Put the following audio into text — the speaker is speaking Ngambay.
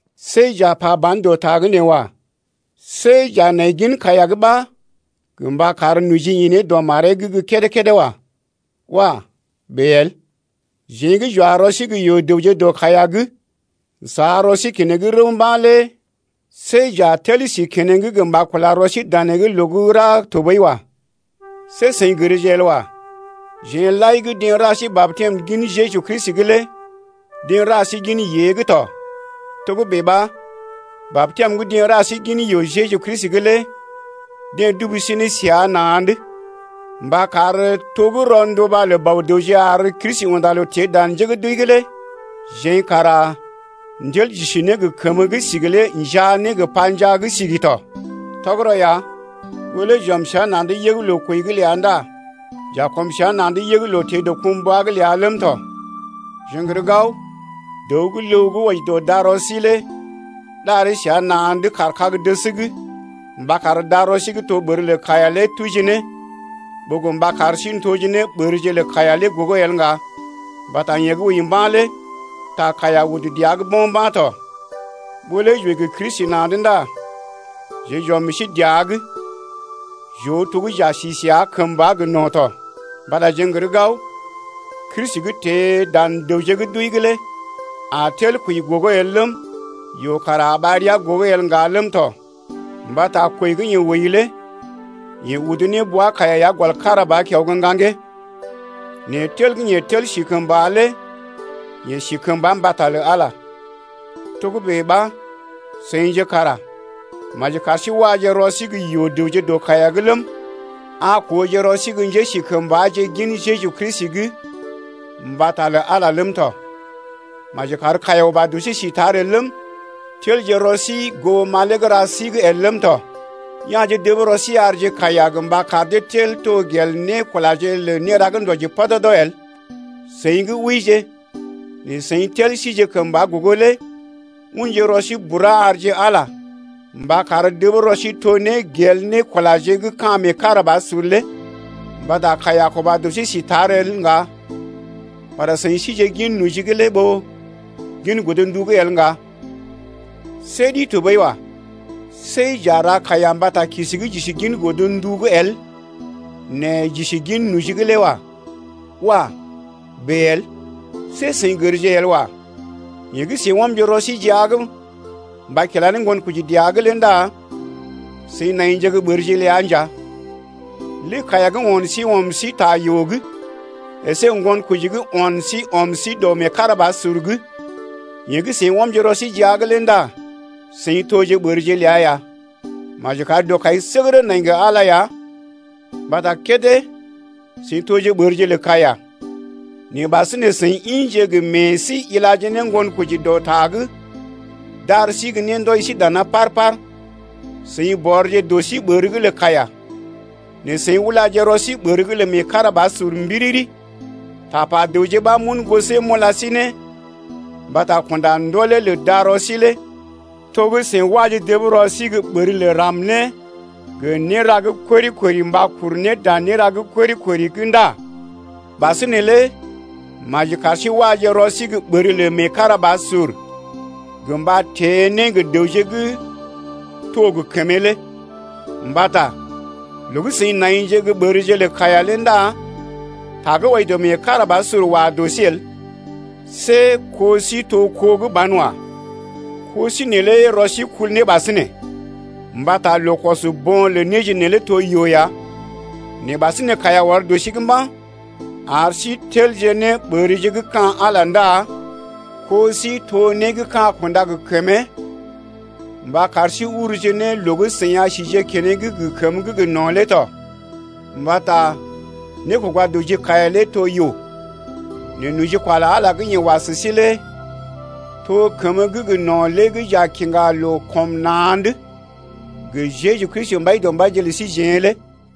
See j’a pa ba̰ dɔ ta’g nee wa. See j’a nai gin kaiya’g ɓa gə mba kar noji ḭ ne dɔ maree’g gə́ kédé-kédé wa. Wah! bèe el. Jeḛ gə́ j’wa rɔ sí gə́ yoo-dəwje dɔ kaiya’g n’sa rɔ sí keneŋ rəw mba̰ lé see j’a tel si keneŋ gə mba kula rɔ sí danee’g loo gə́ ra tɔɓəi wa. See seḭ gərje el wa, jeḛ lai gə́ deḛ ra sí batɛm gin Jeju Kristi’g lé deḛ ra sí gin yée’g tɔ. Togə́bè ɓa batɛm gə́ deḛ ra sí gin yoo Jeju Kristi’g lé deḛ dubu sí səa na̰’d mba kar to gə́ rɔnduba lə Bɔ-dəwje ar Kristi unda loo teḛ dan njé gə́ d’wəi’g lé jeḛ kara n’tel j’isi ne gə kəmə gə́ sigi lé njaa ne gə panjaa gə́ sigi tɔ. Tɔgərɔ ya, ɓó lé j’ɔm səa na̰’d yəg loo-kwəi’g ləa ndá j’a kɔm səa na̰’d yəg loo-teḛ-dɔkumbwa’g ləa ləm tɔ. Jeḛ n’gər gao dəw gə́ ləw gə́ wɔji dɔ darɔ sí lé ɗaree səa na̰’d kaar kag-dəs’g mba kar darɔ sí gə́ to ɓər lə kaiya lé tuji ne ɓó gə mba kar sí n’toje ne ɓərje lə kaiya lé gogo el ŋga. Mbata yeḛ gə́ wəi mba̰ lé ta kaiya udu dəa’g bo̰ mba̰ tɔ. Ɓó lé j’wəi gə Kristi na̰’d ndá jeḛ j’ɔm meḛ sí dəa’g j’oo to gə́ j’a si səa kəmba gə no̰ tɔ, mbata jeḛ n’gər gao Kristi gə́ teḛ dan dəwje gə́ d’wəi’g lé a tel kwəi gogo el ləm, yoo kara a ɓar ria gogo el ŋga ləm tɔ. Mbata kwəi gə́ yeḛ wəi lé yeḛ udu ne bwa-kaiya ya gɔl kára ba kiao gə́ ŋgaŋgee, nɛ tel gə́ yeḛ tel si kəmba lé yeḛ si kəmba mbata lə Ala. Togə́bè ɓa seḭje kara maji kar sí waje rɔ sí gə́ yoo-dəwje dɔ kaiya’g ləm, a kooje rɔ sí gə́ njésikəmbaje gin Jeju Kristi’g mbata lə Ala ləm tɔ. Maji kar kaiya uba dɔ sí si tar el ləm, telje rɔ sí goo malee gə́ ra sí’g el ləm tɔ. Ya̰je dəb rɔ sí arje kaiya gə mba kar dee tel to gel nékulaje lə néra gə́ ndɔji pɔdɔdɔ el. Seḭ gə́ wəije nɛ seḭ tel sije kəmba gogo lé unje rɔ sí bura arje Ala mba kar dəb rɔ sí to ne gel nékulaje gə́ ka̰ meekarabasur lé. Mbata kaiya a kuba dɔ sí si tar el ŋga mbata seḭ síje gin noji’g lé ɓó gin godndu’g el ŋga. See ɗi tɔɓəi wa. See j’a ra kaiya mbata kisi gə́ j’isi gin godndu’g el nɛ j’isi gin noji’g lé wa. Wah! bèe el. See seḭ gərje el wa, yeḛ gə́ seḭ ɔmje rɔ sí jia’g mba kila ne ŋgonkoji dəa’g lé ndá seḭ naije gə́ ɓərje ləa nja. Lé kaiya gə́ o̰ sí ɔm sí ta yoo’g əsé ŋgonkoji gə́ o̰ sí ɔm sí dɔ meekarabasur’g, yeḛ gə́ seḭ ɔmje rɔ sí jia’g lé ndá seḭ toje ɓərje ləa ya. Maji kar dɔkaisəgərə nai gə Ala ya mbata kédé seḭ toje ɓərje lə kaiya nɛ ɓasinè seḭ ḭje gə meḛ sí ilaje ne ŋgonkoji dɔ ta gə́ d’ar sí gə́ né ndɔji sí dana par-par. Seḭ bɔrje dɔ sí ɓər’g lə kaiya, nɛ seḭ ulaje rɔ sí ɓər’g lə meekarabasur mbiriri. Tapa dəwje ɓa m’un gosee m’ula sí ne mbata kunda ndolé lə darɔ sí lé. To gə́ seḭ waje dəb rɔ sí gə́ ɓər lə ram-né gə néra gə́ kori-kori mba kuru ne dan néra gə́ kori-kori’g ndá ɓasinè lé maji kar sí waje rɔ sí gə́ ɓər lə meekarabasur gə mba teḛ ne gə́ dəwje gə́ to gə kəmee lé. Mbata loo gə́ seḭ naije gə́ ɓərje lə kaiya lé ndá ta gə́ wɔji dɔ meekarabasur wa dɔ sí el. See kó sí to kó gə́ banwa. Ko sí neelé rɔ sí kul ne ɓasinè. Mbata loo kɔs bo̰ lə néje neelé to yoo ya. Nɛ ɓasinè kaiya ɔr dɔ sí’g mba̰ ar sí telje ne ɓərje gə́ ka̰ Ala ndá kó sí to né gə́ ka̰ kunda gə kəmee mba kar sí urje ne loo gə́ seḭ a síje keneŋ gə kəmə gə́ gə no̰ lé tɔ. Mbata nékoga dɔ ji kaiya lé to yoo, nɛ nojikwa lə Ala gə́ yeḛ wa sə sí lé to kəmə gə́ gə no̰ lé gə́ j’a kiŋga loo kɔm na̰’d gə Jeju Kristi Mbaidɔmbaije lə síjeḛ lé.